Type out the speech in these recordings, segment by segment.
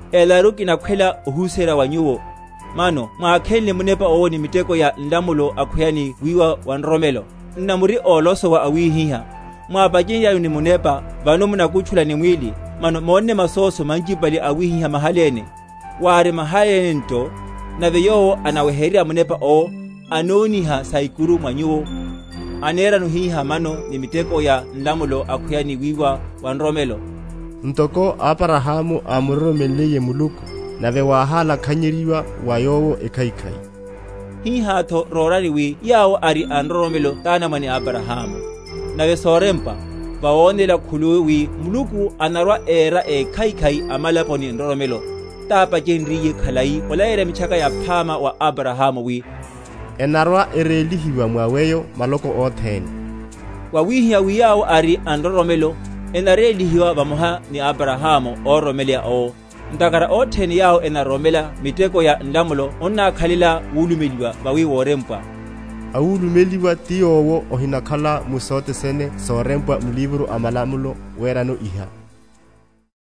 Elaru kinakhwelaka ohuserya wa nyuwo, Mano mwákhenle Munepa owo ni miteko ya nlamulo, akhweya ni wiwa wa nroromelo? Nna muri ólosowa awihiha? Mwápechenryanyu ni Munepa, vano munakutchula ni mwíli? Mano mónne masóso manchipale awihiha mahaléne? wári mahaléne nto. Nave yowo anaweheryerya Munepa owo, anóniha saikuru mwa nyuwo, anerano hihá mano ni miteko ya nlamulo, akhweya ni wiwa wa nroromelo? Ntoko Abrahamu ámuroromenliye Muluku, nave wáhálakhanyenryiwa wa yowo ekhaikhai, hihátho rórani wi yawo ari a nroromelo tánamwane a Abrahamu. Nave sorempwa, vawonela khuluwi wi Muluku anarwa‐awera ékhaikhai amalapo ni nroromelo, tápachenryiye khalai olaleyerya Mitchaka Yaphama wa Abrahmu, wi, Enarwa‐erélihiwa mwa weyo maloko othene. Wawihihá wi yawo ari a nroromelo enarélihiwa vamoha ni Abrahamu óroromeleya owo. Ntakhara othene yawo enaroromela miteko ya nlamulo onnákhalela wulumeliwa; vawi worempwa, Awulumeliwa ti yowo ahinakhala mu sothe sene sorempwa m’livro a malamulo, werano iha.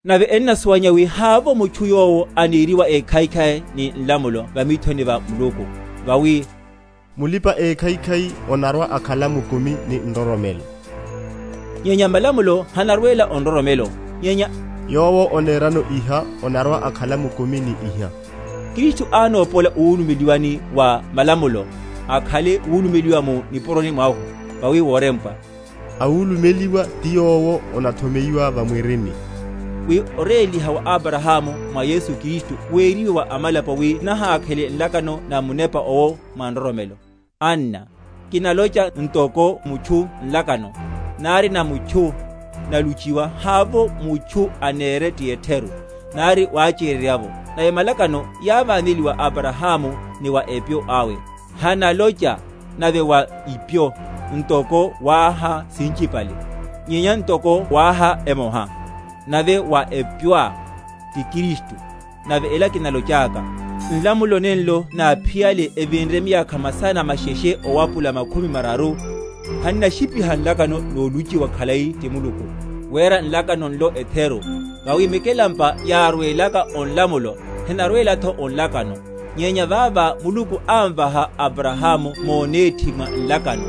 Nave ennasuwanyeya wi havovo mutchu yowo aneriwa ékhaikhai ni nlamulo va mithoni va Muluku; vawi, Mulipa‐ekhaikhai onarwa‐akhala mukumi ni nroromelo; nyenya malamulo hanarwela o nroromelo; nyenya, Yowo onerano iha onarwa‐akhala mukumi ni iha. Kristu ánópola o wulumeliwani wa malamulo, akhanle wulumeliwa mu nipuroni mwahu; vawi worempwa, Awulumeliwa ti yowo onathomeyiwa va mwirini; wi oréliha wa Abrahamu mwa Yesu Kristu, weriwe wa amalapo; wi nahákhele nlakano na Munepa owo, mwa nroromelo. Anna, kinalocha ntoko mutchu Nlakano, nari na mutchu, naluchiwa, havovo mutchu anere ti etheru, nari wacheryerya’vo. Nave malakano yáváneliwa wa Abrahamu, ni wa epyo awe. Hanalocha, nave wa ipyo, ntoko wáha sinchipale; nyenya ntoko wáha emoha, nave wa epyoá, ti Kristu. Nave ela kinalochaka: Nlamulo, nenlo náphiyale evinre miyakha masana masheshe owapula makhumi mararu, hannashípiha nlakano noluchiwa khalai ti Muluku; wera nlakano nlo etheru. Vawi mikelampa yárwelaka o nlamulo, henarwelatho o nlakano; nyenya vava Muluku ámvaha Abrahamu monethi mwa nlakano.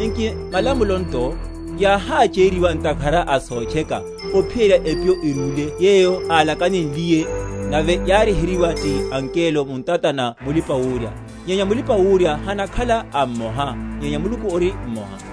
Nki malamulo nto? Yáhácheryeryiwa ntakhara a sotcheka, ophiyerya epyo erúle yeyo alakanenliye; nave yáryeheryiwa ti angelo mu ntata na mulipa‐wurya. Nyenya mulipa‐wurya hanakhala a mmoha; nyenya Muluku ori mmoha.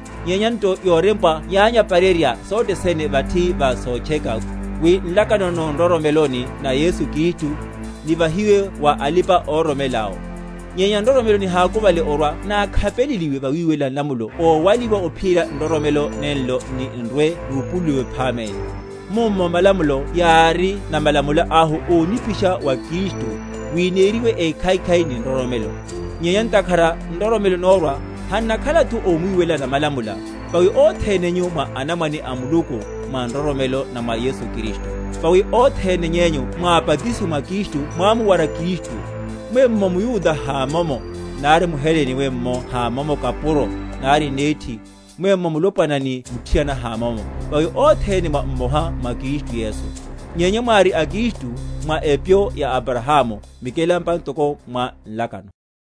Nyenya nto yorempwa yányaparerya sothe sene vathi va sotcheka, wi nlakano no nroromeloni na Yesu Kristu nivahiwe wa alipa‐ororomela awo. Nyenya nroromelo nihákuvale orwa nákhapeleliwe vawiwelela nlamulo ówaliwa ophiyerya nroromelo nenlo n’ni‐nrwe nupululiwe phaméne. Mummo malamulo yári namalamula ahu ónipisha wa Kristu, wi neriwe ékhaikhai ni nroromelo. Nyenya ntakhara nroromelo nórwa, hannakhalatho omwiwelela namalamula. Vawi othene nyu mwa anamwane a Muluku, mwa nroromelo, na mwa Yesu Kristu. Vawi othene nyenyu mwábatisiwe wa Kristu mwámuwara Kristu. Mwenno mYuda hamomo, nari mHelene, mwenno kapuro hamomo, nari nethi, mwenno wulopwana ni muthiana hamomo; vawi othene mwa mmoha mwa Kristu Yesu. Nyenya mwári a Kristu, mwa epyo ya Abrahamu, mikelampa ntoko mwa nlakano.